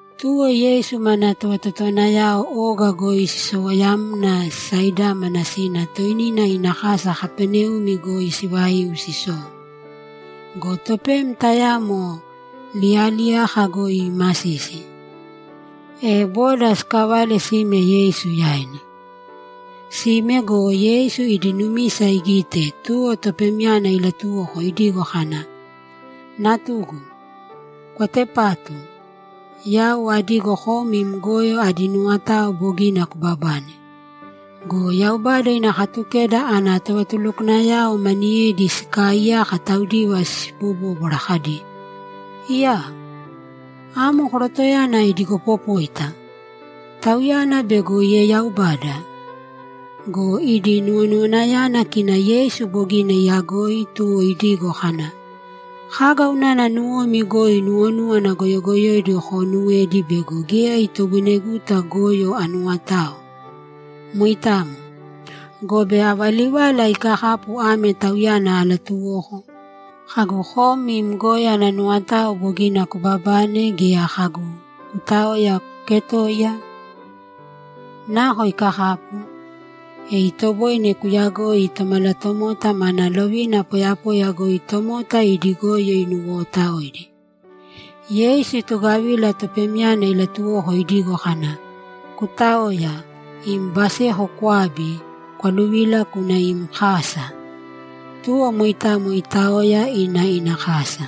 Tuwo Yeisu mana tovatotowanayao oga goi sisowoyamna sisaidámana sina toinina ina kasa goi sivaiu sisou. Go topem tayamo liyaliyaka goi iimasisi, e boda sikavale sime Yeisu yaina. Sime go, Yeisu idi numisa igite, tuwo topemyana ilatuwoko idigo kana, ‘Natugu, kwatepātu. Yau adigo kom im goyo adi nuwotao bogina kubabane.’ Go Yaubada ina Katukeda ana tovatulukwanayao maniyedi sikaaiyaka taudiva sibobóbwara kadi, ‘Iyaa! Amo korotoyana idigopopóita. Tauyana bego ieyaubada!’ Go idi nuwonuwanayana kina Yeisu bogina iyagoi, tuwo idigo kana, ‘Kaga unana nuwomi goi nuwonúwana goyogoyoidi koonuwedi bego geya itoboineguta goyo anuwotao? Moitamo. Gobe ava livala ikakapu ame tauyana alatuwoko? Kagu, “Kom im goyo ana nuwotao bogina kubabane”, gea kagu, “Kutāoya, kuketōiya”? Nako ikakapu? E itoboine koyagoi Tomalatomota mana lovina poyapoya goi tomota idi goyo inuwootaoidi.’ Yeisu itugavila topemyana ilatuwoko idigo kana, ‘Kutāoya, im baseko kwābi, kwaluvīla kūna im kasa!’ Tuwo moitamo itaoya, ina ina kasa.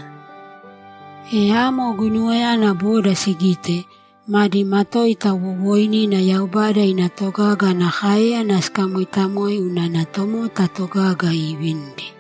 E amo guinuwayana boda sigite, madi matoita wowooinina Yaubada ina togaga ana káeyana sikamoitamoe unana tomota togaga iivinidi.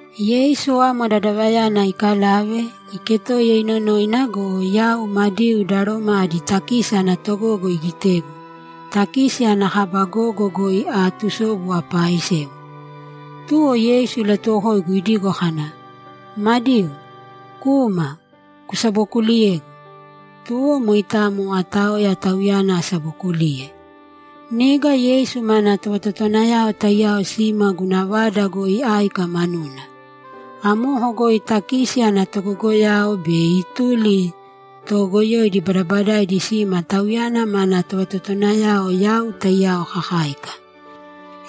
Yeisu amo dadavayana ikalave, iketoiya inonoina go, yau Madiu da Roma adi takisi ana togogo igitegu, takisi ana kaba gogo goi aatusobu apaaisewa. Tuwo Yeisu ilatuwokoigu idigo kana, ‘Madiu, kūma, kusabokuliyēgu.’ Tuwo moitamo ataoya Tauyana asabokuliye. Niga Yeisu mana tovatotowanayao taiyao sima guna vada goi áika manuna. Amoko goi takisi ana togogoyao be ituli ta toogoyoidi badabadaidi sima Tauyana mana tovatotowanayao yau taiyao kakáika.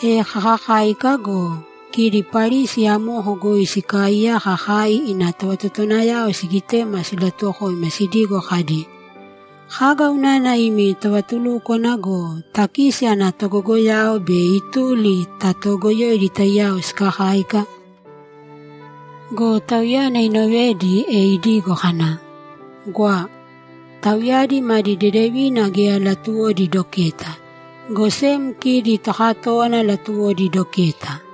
E kakakáika go, kidi Parisi amoko goi sikaaiyaka kai ina tovatotowanayao sigitema silatuwokoima sidigo kadi, ‘Kaga unana imi tovatulúkwana go, takisi ana togogoyao be ituli ta toogoyoidi taiyao sikakáika?’ Go Tauyana inovedi, e idigo kana, ‘Gwa. Tauyadi madi deedevina geya latuwodi doketa, go sem kidi tokatówana latuwodi doketa.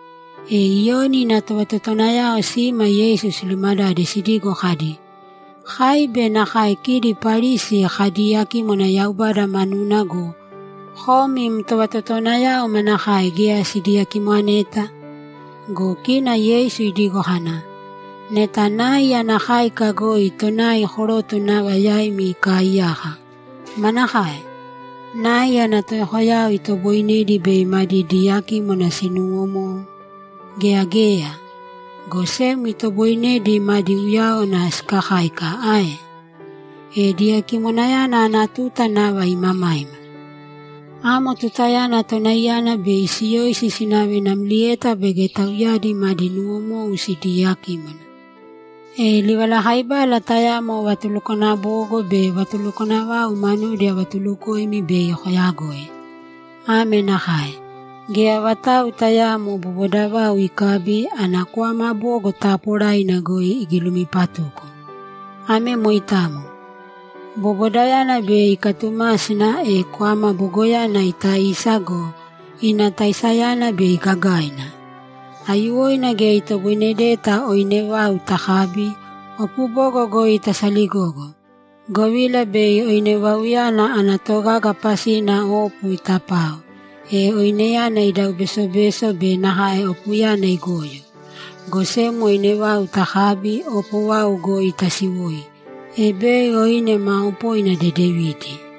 E Iyoni ina tovatotowanayao sima Yeisu silumadade sidigo kadi, ‘Kai be nakae kidi Parisi kadiiyakímwana Yaubada manuna go, kom im tovatotowanayao manakae geya sidiyakimoneta?’ Go kina Yeisu idigo kana, ‘Neta nai ana káika goi tonai koroto nava yaimi ikaaiyaka, manakae? Nai ana toyokoyao itoboinedi bei madi diyakímwana sinuwomou? Geya ae? Go sem itoboinedi madi uyáwana sikakáika ae? E diyakímwana ana tuta nava imamaima. Amo tutayana tonaiyana bei siyoisi sinave namlieta baige tauyadi madi nuwomou sidiyakímwana. E livalakaibala tayamo vatulukwana bogo be vatulukwana vau manudi avatulukoimi bei koyagoi. Ame nakae: Geya vatau tayaamo boboda vau ikabi, ana kwama bogo taaporaina goi igilumipatuko. Ame moitamo. Bobodayana bei ikatumásina, e kwama bogoyana itaisa go, ina taisayana bei gagaina. Aiyuwoina geya itoboinedeta oine vau takabi, opo bogo goi tasaligogo, govila bei oine vauyana ana togaga pasina opo itapao, e oineyana idau besobeso be nakae opoyana igoyo. Go sem oine vau takabi, opo vau goi tasiwoi, e bei oine maa opoina dedevidi.’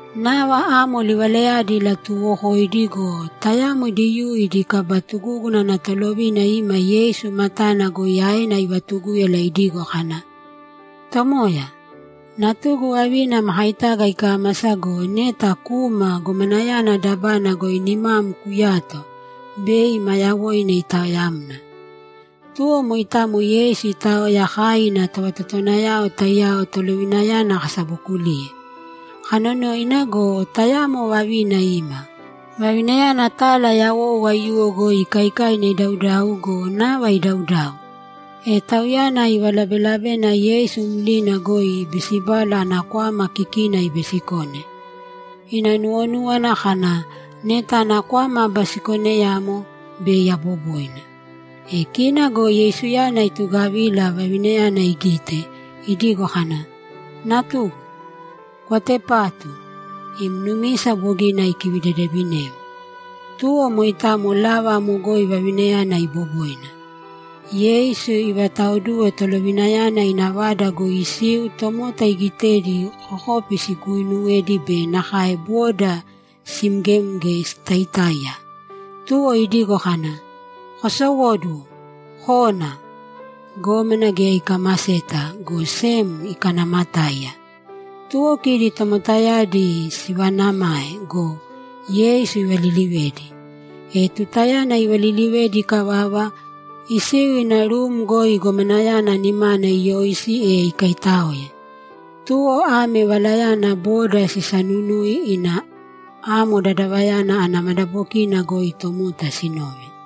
Nava amo livalayadi ilatuuwokoidi go, tayamo Diyuu idi kaba tugúguna ana tolovina ima Yeisu matana goi aena ivatugúyala idigo kana, ‘Tomoya, natugu vavina makaitaga ikámasa go, neta kūma gomanayana dabana goi nimam kuyāto, bei ma yawoina itaoyamna.’ Tuwo moitamo Yeisu itaoya kai ina tovatotowanayao taiyao tolovinayana kasabokuliye. Kanonoina go, tayamo vavina ima. Vavinayana tala yawou aiyuwo goi ikaikaina idaudau go, nava idaudau. E tauyana ivalabelabena Yeisu mlina goi ibisibala ana kwama kikina ibisikone. Ina nuwonúwana kana, ‘Neta ana kwama abisikoneyamo, bei aboboina.’ E kina go Yeisuyana itugavila, vavinayana igite, idigo kana, ‘Natugu, kwatepātu! Im numisa bogina ikidedevinem.’ Tuwo moitamo lava amo goi vavinayana iboboina. Yeisu ivataoduwe tolovinayana ina vada goi isiu tomota igitedi kokopi siiuwedi be nakae boda simgemge sitaitáiya, tuwo idigo kana, ‘Kosowōduwo kōna! Gómana geya ikamaseta, go sem ikanaamatáiya.’ Tuwo kidi tomotayadi sivaanamae go, Yeisu ivalilivedi. E tutayana ivalilivedi ikavava, isiu ina rum goi gomanayana nimana iyoisi, e ikaitáoe. Tuwo ame valayana boda sisanunui ina amo dadavayana ana madabokina goi tomota sinove.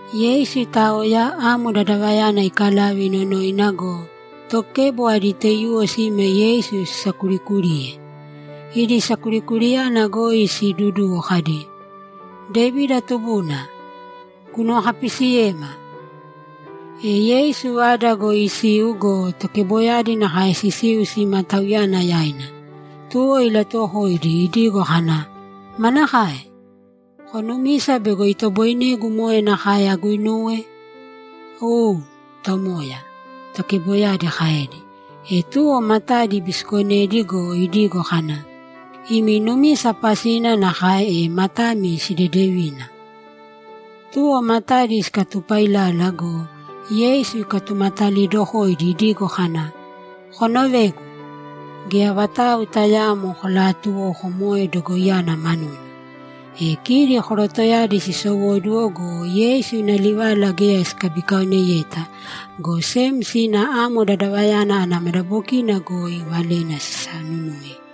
Yeisu itaoya, amo dadavayana ikalave inonoina go, tokebo adi taiyuwo sima Yeisu sisakurikuriye. Idi sakurikuriyana goi siiduduwo kadi, ‘Devida tubuna, kunuwokapisiyēma!’ E Yeisu vada goi isiu go, tokeboyadi nakae sisiu sima Tauyana yaina. Tuwo ilatuwokoidi idigo kana, ‘Manakae? Konumisa bego itoboinegu moe nakae aguinuwe?’ ‘U, Tomoya’, tokeboyadi kaedi. E tuwo matadi ibisikonedi go, idigo kana, ‘Imi numisa pasina nakae, e matami sidedevīna!’ Tuwo matadi sikatupailala go, Yeisu ikatumatalidokoidi idigo kana, ‘Konovēgu. Geya vatau tayaamo kolatuwōko moe dogoiyana manuna.’ E kidi korotoyadi sisowóduwo go, Yeisu ina livala geya sikabikaoneyeta, go sem sina amo dadavayana ana madabokina goi valena sisanunui.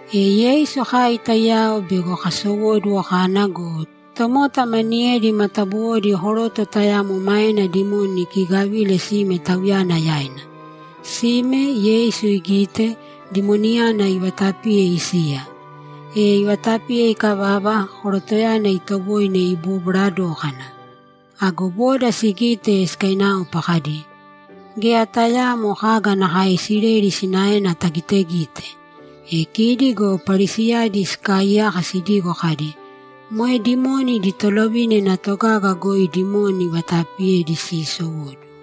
E Yeisu kai taiyao bego kasowóduwo kana go, tomota maniyedi matabuwodi koroto tayamo maena dimoni ikiigavile sime Tauyana yaina. Sime, Yeisu igite, dimoniyana ivatapiye isiya. E ivatapiye ikavava, korotoyana itoboine ibobwara dókana. Ago boda sigite, sikainaopa kadi, ‘Geya tayaamo kaga nakae Isileli sinaena tagitegite!’ E kidi go Parisiyadi sikaaiyaka sidigo kadi, ‘Moe dimoni idi tolovina ina togaga goi dimoni ivataapiyedi siisowóduwo.’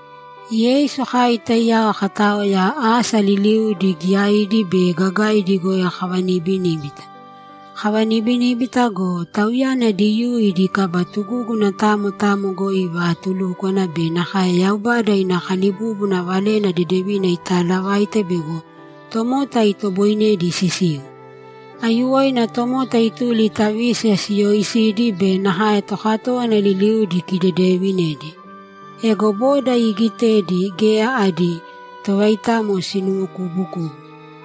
Yeisu kai taiyao kataoya, asa liliudi giyaidi be gagaidi goi kavanibiníbita. Kavanibiníbita go, Tauyana Diyuu idi kaba tugúguna tamo tamo goi ivaatulúkwana be nakae Yaubada ina kalibúbuna Valena Dedevina itaalavaite bego tomota itoboinedi sisiu. Aiyuwoina tomota ituli ta vísiya siyooisidi be nakae tokatówana liliudi ikidedeevinedi. Ego boda iigitedi, geya adi tovaitamo sinuwokubukubu;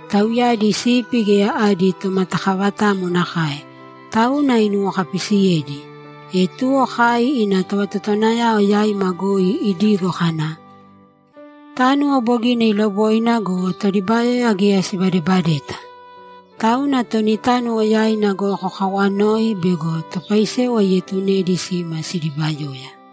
tauyadi sipi geya adi tomatakavatamo nakae, tauna inuwokapisiyedi. E tuwo kai ina tovatotowanayao yaima goi idigo kana, ‘Tánuwo bogina iloboina go, todibayoya geya sibadebadeta. Tauna toni tánuwo yaina goi kokawanōi bego topaisewa ietunedi sima sidibayoya.’